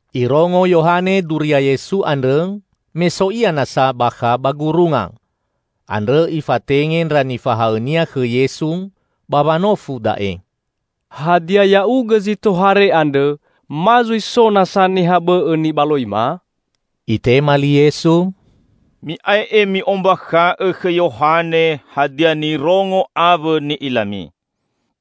Irongo Yohane duria Yesu andrõ me so ia nasa bakha ba gurunga. Andrõ ifatenge ndra nifahaõnia khõ Yesu ba wanofu da'e, "Hadia Ya'ugõ zi tohare andrõ, ma zui so nasa niha bõ'õ nibaloima?" Itema li Yesu, "Mi'ae'e mi'ombakha'õ khõ Yohane hadia nirongo awõ ni'ilami: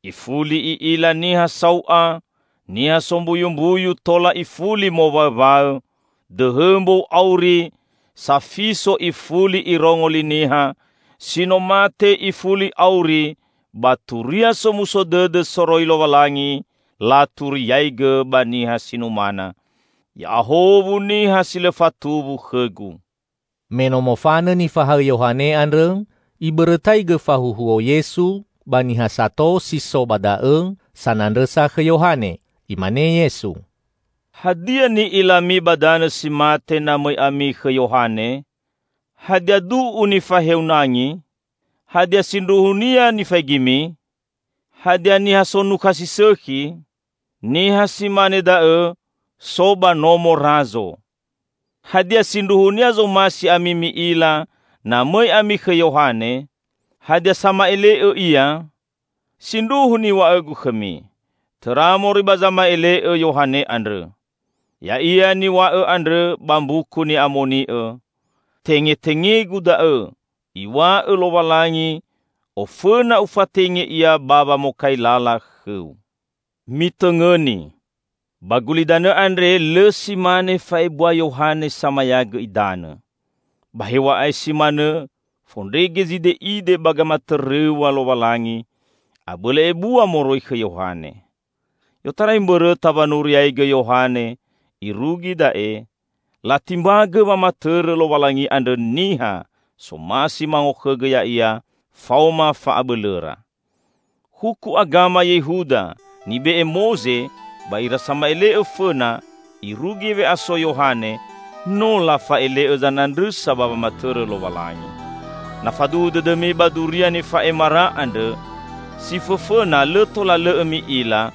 Ifuli i'ila niha sau'a, niha sombuyumbuyu tola ifuli mowaõwaõ, dõhõ mbou auri, safiso ifuli irongo li niha, si no mate ifuli auri, ba Turia Somuso Dõdõ soroi Lowalangi laturiaigõ ba niha si numana. Ya'ahowu niha si lõ fatuwu khõ-Gu!" Me no mofanõ nifahaõ Yohane andrõ, Ibõrõtaigõ fahuhuo Yesu ba niha sato si so ba da'õ sanandrõsa khõ Yohane. Imane Yesu, "Hadia ni'ilami ba danõ si mate na mõi ami khõ Yohane? Hadia du'u nifaheu nangi? Hadia sindruhunia nifaigimi? Hadia niha sonukha si sõkhi? Niha si mane da'õ so ba nomo Razo! Hadia sindruhunia zomasi ami mi'ila, na mõi ami khõ Yohane? Hadia sama'ele'õ ia? Sindruhu niw̃a'õ-Gu khõmi, tõra moroi ba zama'ele'õ Yohane andrõ! Ya'ia niw̃a'õ andrõ ba Mbuku Ni'amoni'õ, 'Tengetenge-Gu da'õ, iw̃a'õ Lowalangi, Ofõna Ufatenge ia ba wamokai lala khõu.' Mitõngõni! Ba gulidanõ andre lõ si mane fa'ebua Yohane Samayagõ Idanõ. Ba hew̃a'ae si manõ, fondrege zide'ide ba gamatõrõw̃a Lowalangi, abõlõ ebua moroi khõ Yohane. I'otarai mbõrõta wanuriaigõ Yohane irugi da'e, latimbagõ wamatõrõ Lowalangi andrõ niha somasi mangokhõgõ ya'ia faoma fa'abõlõra. Huku agama Yehuda nibe'e Moze ba ira sama'ele'õ fõna irugi we'aso Yohane, no lafa'ele'õ zanandrõsa ba wamatõrõ Lowalangi. Na faduhu dõdõmi ba duria nifa'emara andrõ, si fõfõna lõ tola lõ'õ mi'ila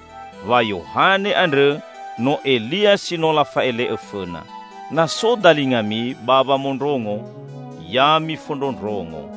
wa Yohane andrõ no Elia si no lafa'ele'õ fõna. Na so dalingami ba wamondrongo, ya mifondrondrongo!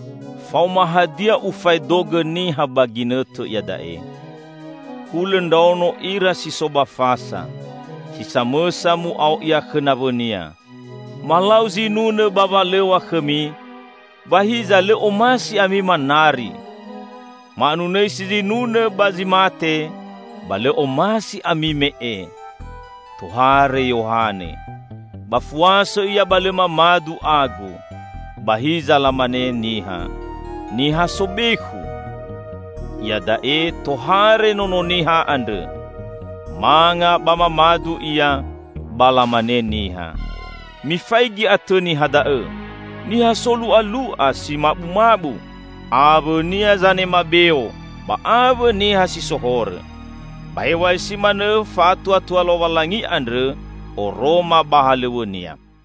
Faoma hadia Ufaedogõ niha ba ginõtõ iada'e? Hulõ ndraono ira si so ba fasa; si samõsa mu'ao ia khõ nawõnia, 'Malau zinunõ ba walõw̃a khõmi, ba hiza lõ omasi ami manari! Ma'anunõisi zinunõ ba zi mate, ba lõ omasi ami me'e!' Tohare Yohane -- ba fuasõ ia ba lõ mamadu agu; ba hiza lamane niha, 'Niha sobekhu!' Iada'e tohare Nono Niha andrõ -- manga ba mamadu Ia, ba lamane niha, 'Mifaigi atõ niha da'õ! Niha solu'alu'a, si mabumabu, awõ-Nia zanema beo ba awõ niha si so horõ.' Ba hew̃a'ae si manõ fa'atuatua Lowalangi andrõ oroma ba halõw̃õ-Nia."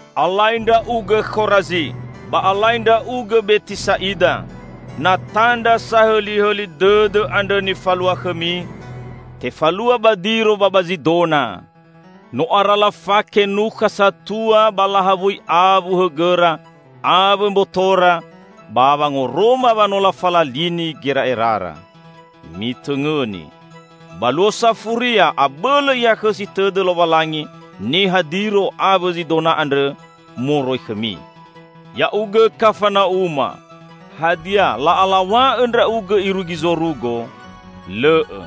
"Alai ndra'ugõ Khorazi! Ba alai ndra'ugõ Betisa'ida! Na tandra sahõlihõli dõdõ andrõ nifalua khõmi, tefalua ba Diro ba ba Zidona, no ara lafake nukha satua ba lahawui awu hõgõra awõ mbotora, ba wangoroma wa no lafalalini gera'erara! Mitõngõni, ba Luo Safuria abõlõ ihakhõsi tõdõ Lowalangi niha Diro awõ Zidona andrõ moroi khõmi! Ya'ugõ, Kafana'uma! Hadia, la'alaw̃a'õ ndra'ugõ irugi zorugo? Lõ'õ!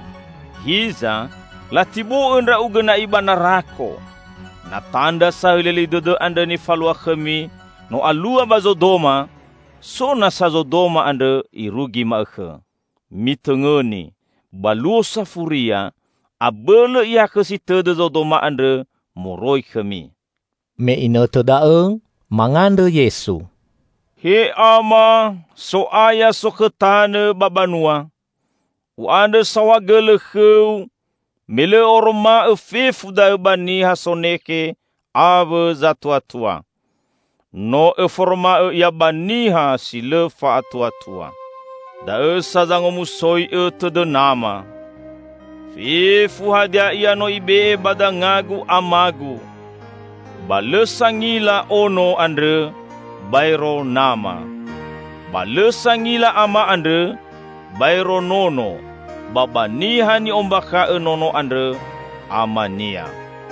Hiza, latibo'õ ndra'ugõ na'i ba narako! Na tandra sahõlihõli dõdõ andrõ nifalua khõmi no alua ba Zodoma, so nasa Zodoma andrõ irugi ma'õkhõ! Mitõngõni, ba Luo Safuria, abõlõ ihakhõsi tõdõ Zodoma andrõ moroi khõmi!" Me inõtõ da'õ mangandrõ Yesu, "He Ama, So'aya sokhõ tanõ ba banua! U'andrõ saohagõlõ khõ-U me lõ Õ'oroma'õ fefu da'õ ba niha sonekhe awõ zatuatua. No Õforoma'õ ia ba niha si lõ fa'atuatua. Da'õ sa zangomusoi'õ tõdõ Nama." "Fefu hadia ia no Ibe'e ba danga-Gu Ama-Gu. Ba lõ sangila Ono andrõ, baero Nama. Ba lõ sangila Ama andrõ, baero Nono, ba ba niha ni'ombakha'õ Nono andrõ, Ama-Nia.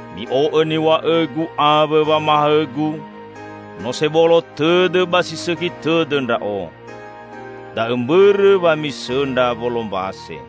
Mi'o'õ niw̃a'õ-Gu awõ wamahaõ-Gu. No sebolo tõdõ ba si sõkhi tõdõ Ndra'o. Da'õ mbõrõ wa misõndra wolombase.